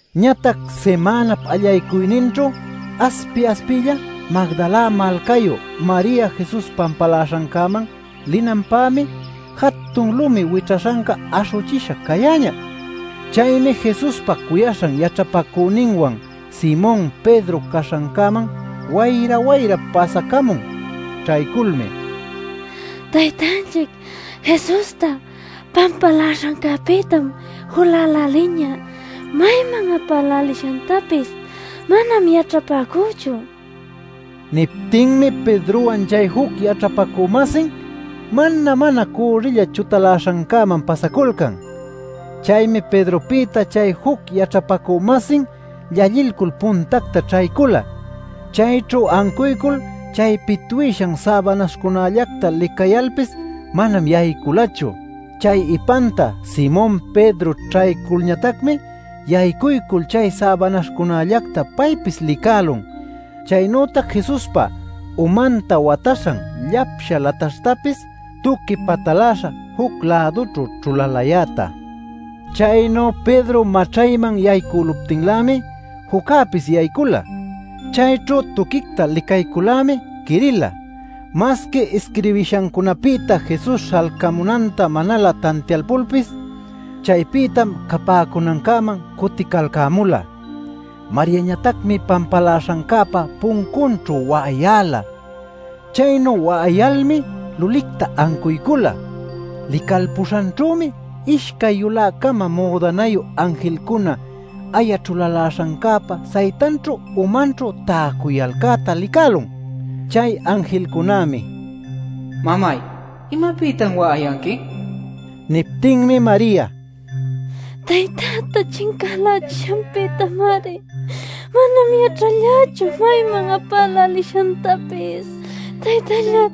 Ñatac simänap allaycuyninćhu aspi-aspilla Magdala malcayu Maria Jesus pampaläśhancäman linanpämi jatun lumi wićhaśhanca aśhüchisha cayäñä. Chaymi Jesuspa cuyaśhan yaćhapacüninwan Simon Pedro caśhancäman wayra-wayra pasacamun. Ćhayculmi: “¡Taytanchic Jesusta pampaläśhancäpïtam juläläliñä! ¡Mayman apälälishantapis manam yaćhapäcüchu!” nicuyan. Niptinmi Pedrowan chay juc yaćhapacü-masin mana-mana cürrilla chutaläśhancäman pasaculcan. Chaymi Pedropïta chay juc yaćhapacü-masin llallilcul puntacta ćhaycula. Chayćhu ancuycul chay pitwishan säbanaśhcunällacta licayalpis manam yayculachu. Chay ipanta Simon Pedro ćhayculñatacmi yaycuycul chay säbanaśhcunällacta paypis licälun chaynütac Jesuspa umanta wataśhan llapsha lataśhtapis tuqui pataläśha juc-lädućhu ćhulalayäta. Chaynu Pedro maćhayman yaycüluptinlämi juccäpis yaycula. Chayćhu tuquicta licaycul-lämi quirila masqui isquirbishancunapïta Jesus śhalcamunanta manalä tantialpulpis. Chaypïtam capäcunancäman cuticalcämula. Mariañatacmi pampaläśhancäpa puncunćhu wa'ayäla. Chaynu wa'ayalmi lulicta ancuycula. Licalpuśhanćhümi ishcay yulä-cama müdanayu anjilcuna aya ćhulaläśhancäpa saytanćhu umanćhu täcuyalcäta licälun. Chay anjilcunämi: “Mamay, ¿imapïtan wa'ayanqui?” nin. Niptinmi Maria: “Taytäta chincalächishanpïtamari. Manam yaćhallächu mayman apälälishantapis” nin.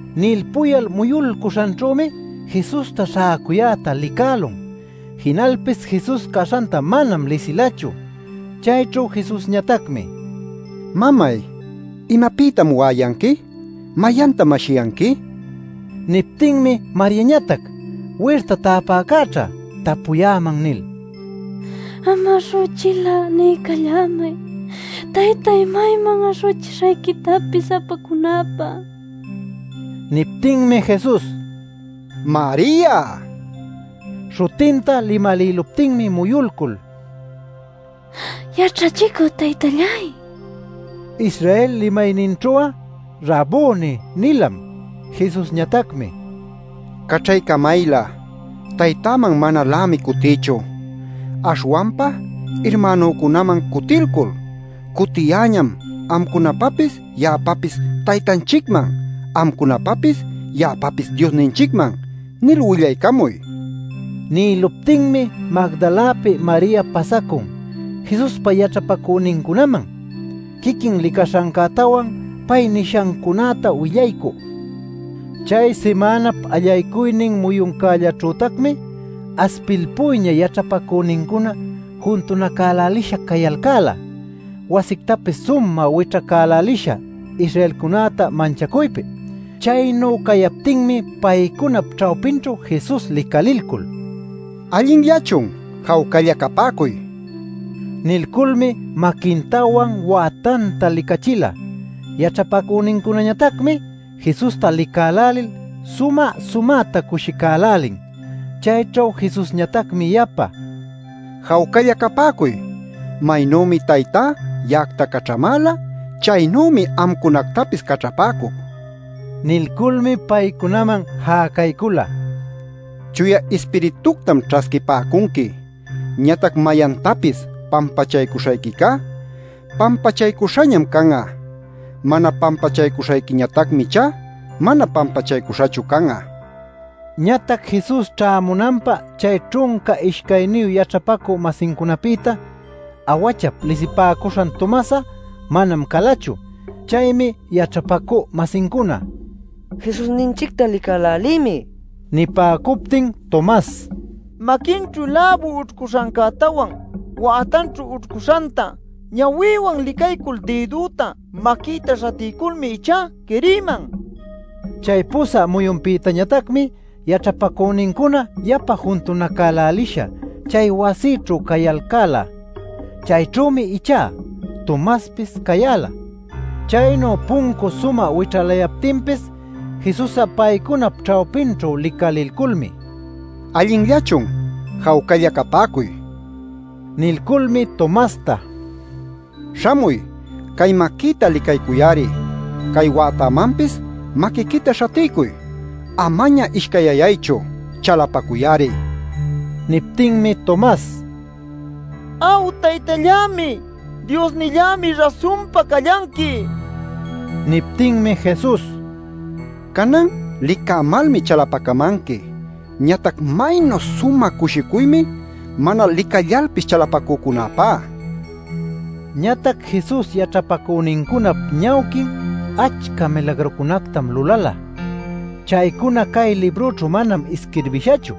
Nilpuyal muyulcuśhanćhümi Jesusta śhäcuyäta licälun. Jinalpis Jesus caśhanta manam lisilachu. Chayćhu Jesusñatacmi: “Mamay, ¿imapïtan wa'ayanqui? ¿Mayantam ashiyanqui?” nin. Niptinmi Mariañatac “Wirta täpäcäćhá tapuyäman” nil “Am aśhuchil'a niycallämay, taytay, mayman aśhuchishayquitapis apacunäpä” nin. Niptinmi Jesus: “Maria” nin. Śhutinta limalïluptinmi muyulcul “¡Yaćhachicü taytalláy!” nin. (Israel limayninćhu'a “Rabuni” nilam.) Jesusñatacmi: “Caćhaycamaylä; Taytäman manalämi cutïchu. Aśhwanpa irmänücunaman cutilcul: ‘Cutiyäñam amcunapapis ya'apapis Taytanchicman, amcunapapis ya'apapis Diosninchicman’ nil willaycamuy” nin. Nïluptinmi Magdalapi Maria pasacun Jesuspa yaćhapacünincunaman, quiquin licaśhancätawan, pay nishancunäta willaycü. Chay simänap allaycuynin muyuncälläćhütacmi aspilpuyña yaćhapacünincuna juntunacälälisha cayalcäla wasictapis sumä wićhacälälisha Israelcunäta manchacuypi. Chaynu cayaptinmi paycunap ćhawpinćhu Jesus licalilcul “¿Allinllachun? Jawcalla capäcuy” nin. Nilculmi maquintawan wätanta licachila. Yaćhapacünincunañatacmi Jesusta licälälil sumä-sumäta cushicälälin. Chayćhu Jesusñatacmi yapa: “Jawcalla capäcuy. Maynümi Taytá ya'acta caćhamäla, chaynümi amcunactapis caćhapäcuc” nin. Nilculmi paycunaman jäcaycula: “Chuya Ispirituctam ćhasquipäcunqui. Ñatac mayantapis pampachaycuśhayquicá pampachaycuśhañam can'a; mana pampachaycuśhayquiñatacmi ichá mana pampachaycuśhachu can'a” nil. Ñatac Jesus ćhämunanpä chay ćhunca ishcayniyu yaćhapacü-masincunapïta “Awachap” lisipäcuśhan Tomas'a, manam calachu. Chaymi yaćhapacü-masincuna: “Jesusninchicta licälälïmi” nipäcuptin Tomas: “Maquinćhu läbu ućhcuśhancätawan, wätanćhu ućhcuśhanta ñawïwan licaycul dïdüta maquïta śhatiyculmi ichá quirïman” nin. Chay pusä muyunpïtañatacmi yaćhapacünincuna yapa juntunacälälisha chay wasićhu cayalcäla. Chayćhümi ichá Tomaspis cayäla. Chaynu puncu sumä wićhalayaptinpis Jesus'a paycunap ćhawpinćhu licalilculmi: “¿Allinllachun? Jawcalla capäcuy” nin. Nilculmi Tomasta: “Śhamuy cay maquïta licaycuy-ari; cay wätämanpis maquiquita śhatiycuy. ¡Amaña ishcayyaychu! ¡Chalapacuy-ari!” nin. Niptinmi Tomas: “¡Aw Taytallämi Diosnillämi rasunpa callanqui!” nïlun. Niptinmi Jesus: “Canan licämalmi chalapacamanqui. Ñatac maynu sumä cushicuymi mana licallalpis chalapacücunäpá” nin. Ñatac Jesus yaćhapacünincunap ñawquin achca milagrucunactam lulala. Chaycuna cay librućhu manam isquirbishachu.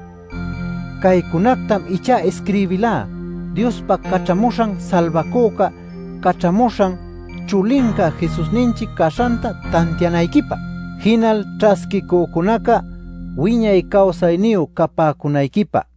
Caycunactam ichá isquirbilá Diospa Caćhamuśhan Salbacüca, Caćhamuśhan Chulinca Jesusninchic caśhanta tantianayquipä, jinal ćhasquicücunaca wiñay cawsayniyu capäcunayquipä.